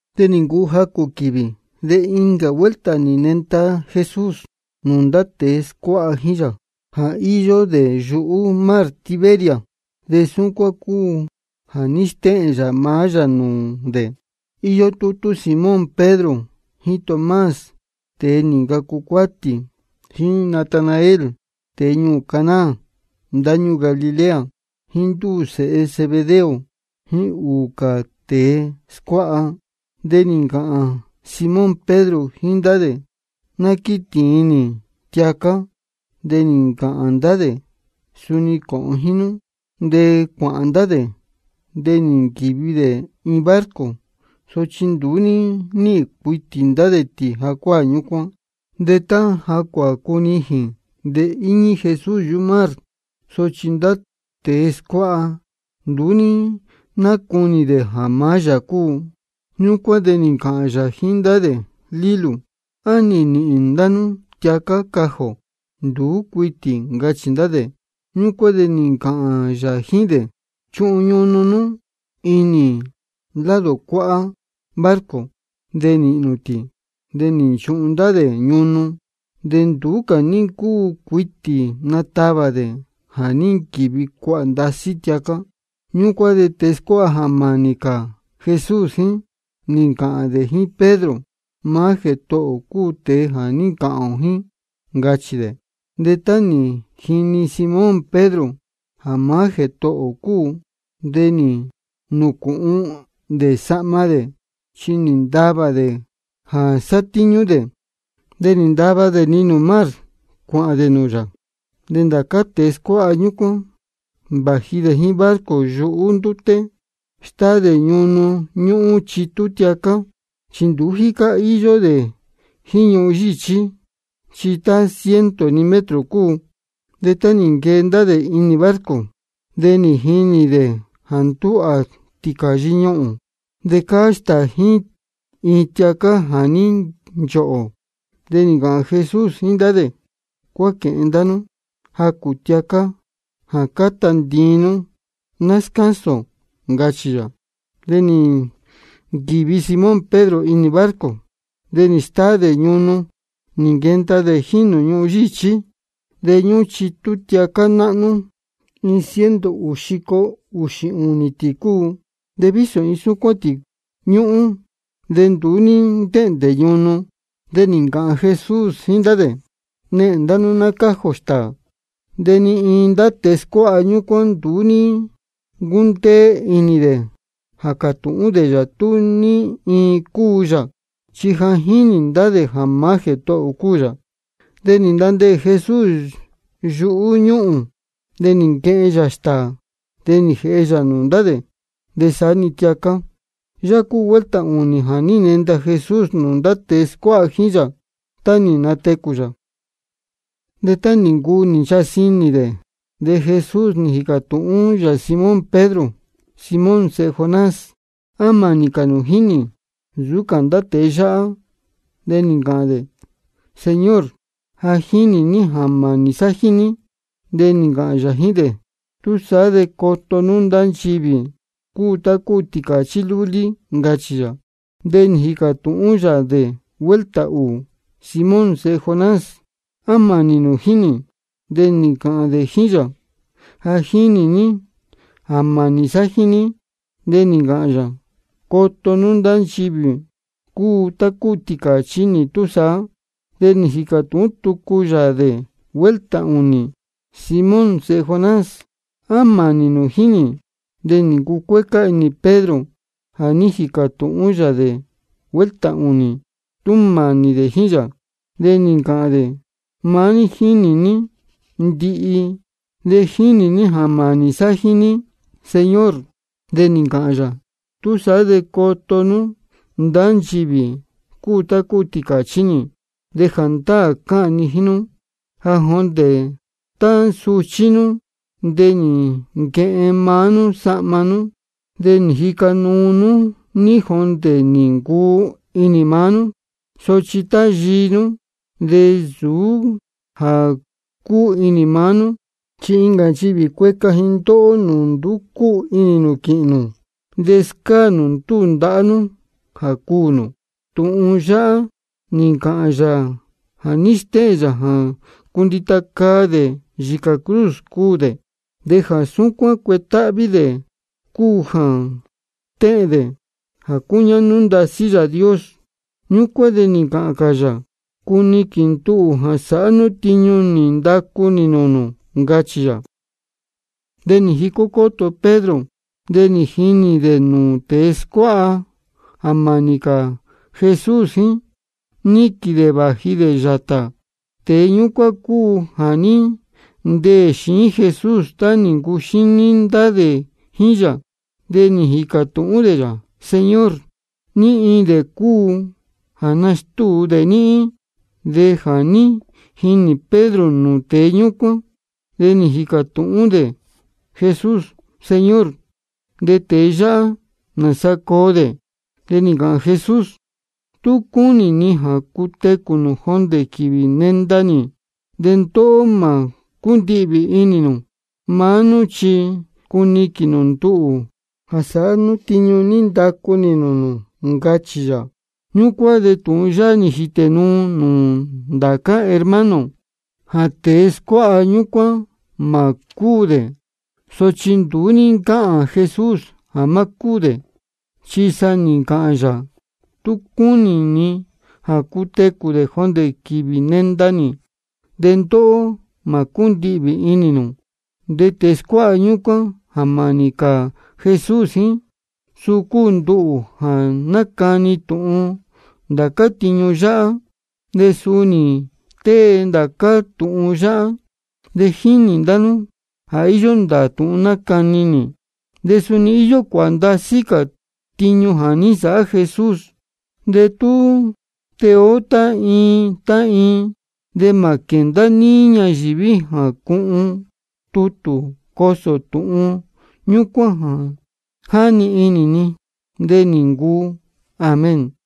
De nī ncuu jacū quīvī, de incā vuelta nī nenda Jesús nūū ndá tēe scuáha jíín yā, jā íyó dē yuhú mar Tiberias. De súcuán cúu jā ní stéhēn yā maá yā nūū dē: Iyó tútú Simón Pedro, jíín Tomás, tēe nī ncacu cuátī, jíín Natanael, tēe ñuū Caná ndáñúū Galilea, jíín ndúū sēhe Zebedeo, jíín ūū cā tēe scuáha. De nī ncāhān Simón Pedro jíín ndá dē: Ná quítīin nī tiacá. De nī ncāhān ndá dē: Suni cōhōn jíín nú. De cuāhān ndá dē, de nī nquīvi dē iin barco. Sochi nduú ní níhīn cuitī ndá dē tī jacuáā ñúcuán. De tá cuācunijīn, de íñí Jesús yuhú mar. Sochi ndá tēe scuáha, nduú ní nácunī dē jā maá yā cúu. Ñúcuán de nī ncāhān yā jíín ndá dē: Lílū, ¿á nī nīhīn ndá nú tiacá cajī ō? Nduú cuitī, ncachī ndá dē. Ñúcuán de nī ncāhān yā jíín dē: Chuhun ñunu nú ichi lado cuáhá barco, de nīhīn nū tī. De nī nchuhun ndá dē ñunu, de nduú cā ní ncúu cuitī natavā dē, jā ní nquīvi cuāhā ndasí tiacá. Ñúcuán de tēe scuáha jā mānī cā Jesús jíín, nī ncāhān dē jíín Pedro: Maá Jētohō ō cúu tēe jā ní ncāhān ō jíín, ncachī dē. De tá nī jini Simón Pedro jā maá Jētohō ō cúu, de nī nūcūhun dē sahma dē, chi nī ntavā dē jā sátíñú dē. De nī ndava dē-ni nūū mar, cuāhān dē nūū yā. De ndá cā tēe scuáha ñúcuán, vāji dē jíín barco yuhú ndúté, stáá dē ñunu ñúhún chitú tiacá. Chi nduú jícá íyó dē jíín ñuhun yíchí, chi tá ciento-ni metro cúu. De tá nī nquee ndá dē inī barco, de nī jinī dē jā ndúhā tīcāyi ñuhūn, de cáá stāā jíín iin tiacá jā ní nchohō. De nī ncāhān Jesús jíín ndá dē: Cuáquēhen ndá nú jacū tiacá jā cáta ntiin nú, ná scásūn ō, ncachī yā. De nī nquīvi Simón Pedro inī barco, de nī stáá dē ñunu, nī nquenda dē jíín nūū ñuhun yíchí. De ñúhún chitú tiacá náhnú, iin ciento ūū xico ūxī ūnī tī cúu. De vísō iin súcuán tī ñúhún, de nduú ní ntéhndē ñunu. De nī ncāhān Jesús jíín ndá dē: Nehēn ndá nú ná cájī ō stāā. De ni iin ndá tēe scuáha ñúcuán nduú ní ncúndeé inī dē jā cātūhún dē yā tú ní iin cúu yā. Chi ja jínī ndá dē jā maá Jētohō ō cúu yā. De nī ntandeē Jesús yuhú ñúhūn, de nī nquehen yā stāā, de nī jēhe yā nūū ndá dē, de saá-ni tiacá. Yáhá cúu vuelta ūnī jā ní nenda Jesús nūū ndá tēe scuáha jíín yā, tá nī natecū yā. De tá nī ncuu nī nchasī inī dē, de Jesús nī jīcā tūhún yā Simón Pedro: Simón sēhe Jonás, ¿á mānī cā nū jíín nī nsūú cā ndá cā tēe yáhá? De nī ncāhān dē: Señor, ja jínī ní jā mānī sá jíín ní. De nī ncāhān yā jíín dē: Túsaá de coto nú ndá nchivī cúu tá cúu tīcāchí lúlí nī, ncachī yā. De nī jīcā tūhún yā dē vuelta ūū: Simón sēhe Jonás, ¿á mānī nū jíín nī? De nī ncāhān dē jíín yā: Ja jínī ní jā mānī sá jíín ní. De nī ncāhān yā: Coto nú ndá nchivī cúu tá cúu tīcāchí nī túsaá. De nī jīcā tūhún tucu yā dē vuelta ūnī: Simón sēhe Jonás, ¿á mānī nū jíín nī? De nī ncucuécá inī Pedro jā ní jīcā tūhún yā dē vuelta ūnī tú mānī dē jíín yā. De nī ncāhān dē: Maá ní jínī ní ndihi, de jínī ní jā mānī sá jíín ní, Señor. De nī ncāhān yā: Túsaá de coto nú ndá nchivī cúu tá cúu tīcāchí nī. De jāndáā cáhān ni jíín nú jā jondē tá suchí nú de nī nquehen maá nú sahma nú, de nī jica nú ní jondē nī ncuu inī maá nú. Sochi tá yii nú, de nsūú jā cúu inī maá nú, chi incā nchivī cueca ji ndóhó nūū nduú cúu inī nū quīhīn nū, de scáā nū ndúū ndahá nú jā cuū nū. Tūhun yáhá nī ncāhān yā jā ní stéhēn yā jā cundita caa dē yīcā cruz cuū dē, de jā súcuán cuetáhví dē cúu jā stéhēn dē jā cúñáhnú ndasí Yāā Dios. Ñúcuán de nī ncāhān cā yā: Cuniquīn nduhū jā sāhá nú tiñu nī ndacu nī nūū nū, ncachī yā. De nī jicó cóto Pedro, de nī jinī dē nūū tēe scuáha jā mānī cā Jesús jíín, níquīn dē vāji dē yātā. Tēe ñúcuán cúu jā ní ndeē xiín Jesús tá nī ncuxíní ndá dē jíín yā, de nī jīcā tūhún dē yā: Señor, ¿ní iin dē cúu jā nastúu dē níhín? De jā ní jinī Pedro nūū tēe ñúcuán, de nī jīcā tūhún dē Jesús: Señor, ¿de tēe yáhá, nāsa coo dē? De nī ncāhān Jesús: Tú cúnī ni jā cutecū dē jondē quīvī nenda nī, de ndóhó mā cúndihvī inī nū. Maá nú chi cuniquīn nū nduhū jā sāhá nú tiñu nī ndacu nī nūū nū, ncachī yā. Ñúcuán de tūhun yáhá nī jītē nuu nūū ndācá hermano, jā tēe scuáha ñúcuán mā cúū dē. Sochi nduú ní ncáhān Jesús jā má cúū dē, chi sa nī ncāhān yā: Tú cúnī ni jā cutecū dē jondē quīvī nenda nī, de ndóhó mā cúndihvī inī nū. De tēe scuáha ñúcuán jā mānī cā Jesús jíín, suu cúu nduhū jā nácani tūhun ndācá tiñu yáhá, de suu nī tée ndācá tūhun yáhá. De jínī ndá nú jā íyó ndāā tūhun nácani nī. De suni íyó cuāhā ndasí cā tiñu jā ní nsāhá Jesús. De tú tee ó tá iin tá iin, de mā quēndá níí ñayīví jā cuhun tutū jā cosō tūhun ñúcuán, jáni inī ni. De nī ncuu. Amén.